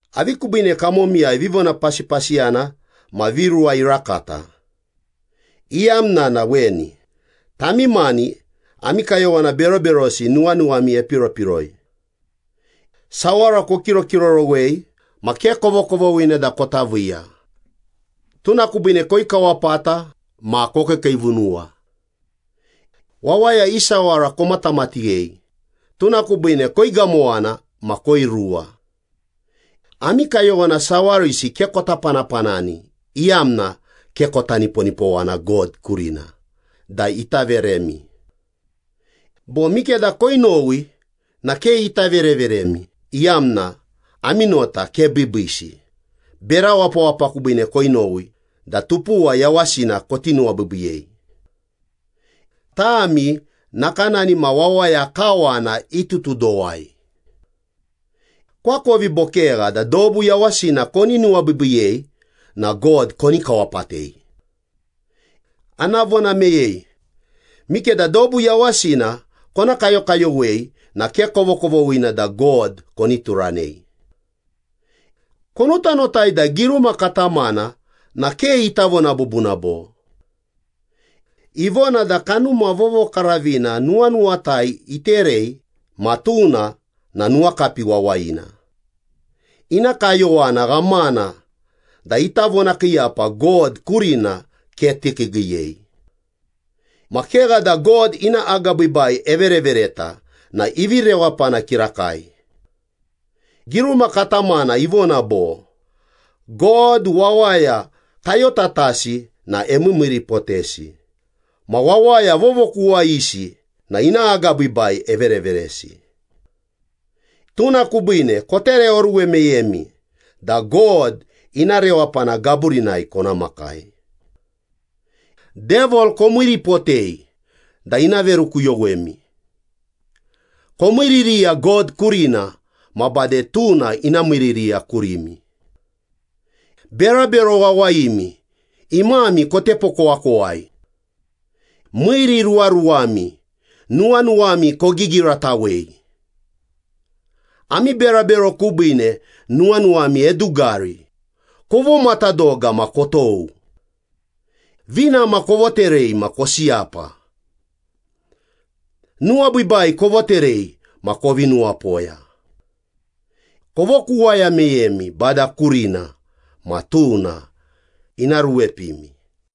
Avi kubiine kamomiyai vivonapasipasiyana ma viruwa irakata? Iyamna na weni, tami mani ami kayowana beroberosi nuwanuwami epiropiroi. Sawara kokirokirorowei ma ke kovokovoghina da kota viiya, tuna kubiine koikawapata ma kokiikiivunuwa. Wawaya i sawara komatamatighei, tuna kubiine koigamowana ma koiruwa. Ami kayowana sawarisi ke kota panapanani iyamna ke kota niponipowana God kurina da ita veremi. Bo mikeda koinowi na ke ita vereveremi, iyamna ami nota ke biibiisi, bera wapawapa kubiine koinowi da tupuwa yawasina koti nuwabiibiiyei. Tami nakanani ma wawaya kawana itutudowai! Koakovi bo kegha da dobu yawasina koni nuwabiibiiyei na God koni kawapatei? Ana vona meyei, mikeda dobu yawasina kona kayokayowei na ke kovokovoghina da God koni turanei. Konotanotai da giruma katamana na ke ita vona bubuna bo? Ivona da Kanuma Vovokaravina nuwanuwatai iterei ma tuna na nuwakapi wawayina, ina kayowana ghamana da ita vonakiiyapa God kurina ke tikiigiiyei. Ma kegha da God ina agabiibai everevereta na ivi rewapana kirakai. Giruma katamana ivona bo, “God wawaya kayotatasi na emiimiiripotesi, ma wawaya vovokuwayisi na ina agabiibai evereveresi.” Tuna kubiine kotereoruwe meyemi da God ina rewapana gaburinai kona makai. Devil komiiripotei da ina verukuyowemi. Komiiririya God kurina ma bade tuna ina miiririya kurimi. Berabero wawayimi, imami kotepokowakowai. Miiriruwaruwami, nuwanuwami kogigiratawei. Ami berabero kubiine nuwanuwami edugari, kovomatadoga ma kotou. Vinama kovoterei ma kosiyapa. Nuwabiibai kovoterei ma kovi nuwapoya. Kovokuwaya meyemi Bada kurina, ma tuna ina ruepimi.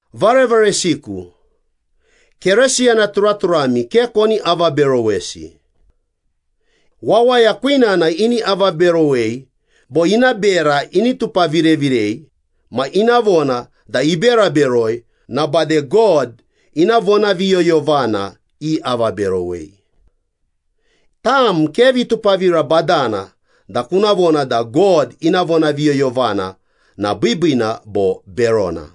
Varevaresiku, Keresiyana turaturami ke koni avaberowesi. Wawaya kwinana ini avaberowei bo ina bera ini tupavirevirei ma ina vona da ibera beroi na bade God ina vonaviyoyovana iavaberowei. Tam ke vitupavira badana da kuna vona da God ina vonaviyoyovana na biibiina bo berona.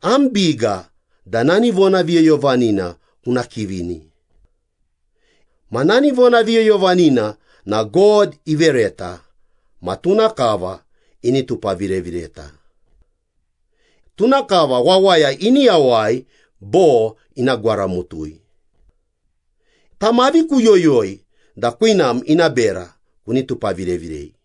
Am biga da nani vonaviyoyovanina kuna kivini. Ma nani vonaviyoyovanina na God ivereta ma tuna kava ini tupavirevireta. Tuna kava wawaya ini yawai bo ina gwaramutui. Tam avi kuyoyoi da kwinam ina bera kuni tupaviravirei?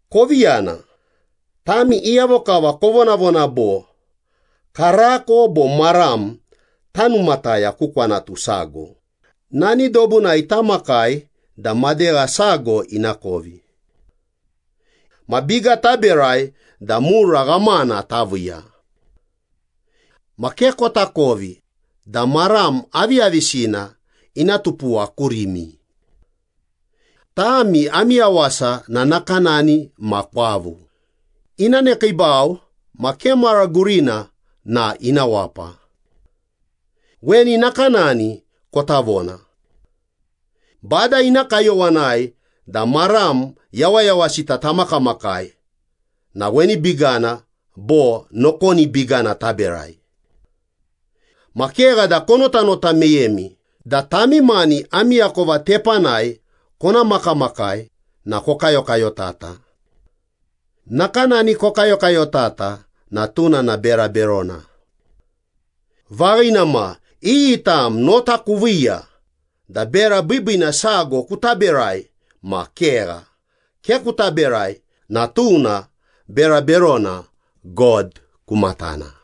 Kovi yana, tami iyavo kava kovonavona bo, “Karako bo maram tanumataya ku kwanatu sago, nani dobunai tamakai da madegha sago ina kovi. Ma biga taberai da mura ghamana taviiya.” Ma ke kotakovi da maram aviyavisina ina tupuwa kurimi. Tami ami yawasa na nakanani ma kwavu, ina nekiibau ma ke mara gurina na ina wapa. Weni nakanani kota vona. “Bada ina kayowanai da maram yawayawasita tamakamakai na weni bigana bo nokoni bigana taberai.” Ma kegha da konotanota meyemi da tami mani ami akova tepanai kona makamakai na kokayokayotata. Nakanani kokayokayotata na tuna na bera berona. Vaghina ma, iyi tam nota kuviiya da bera biibiina sago kuta berai ma kegha, ke kuta berai na tuna bera berona God ku matana.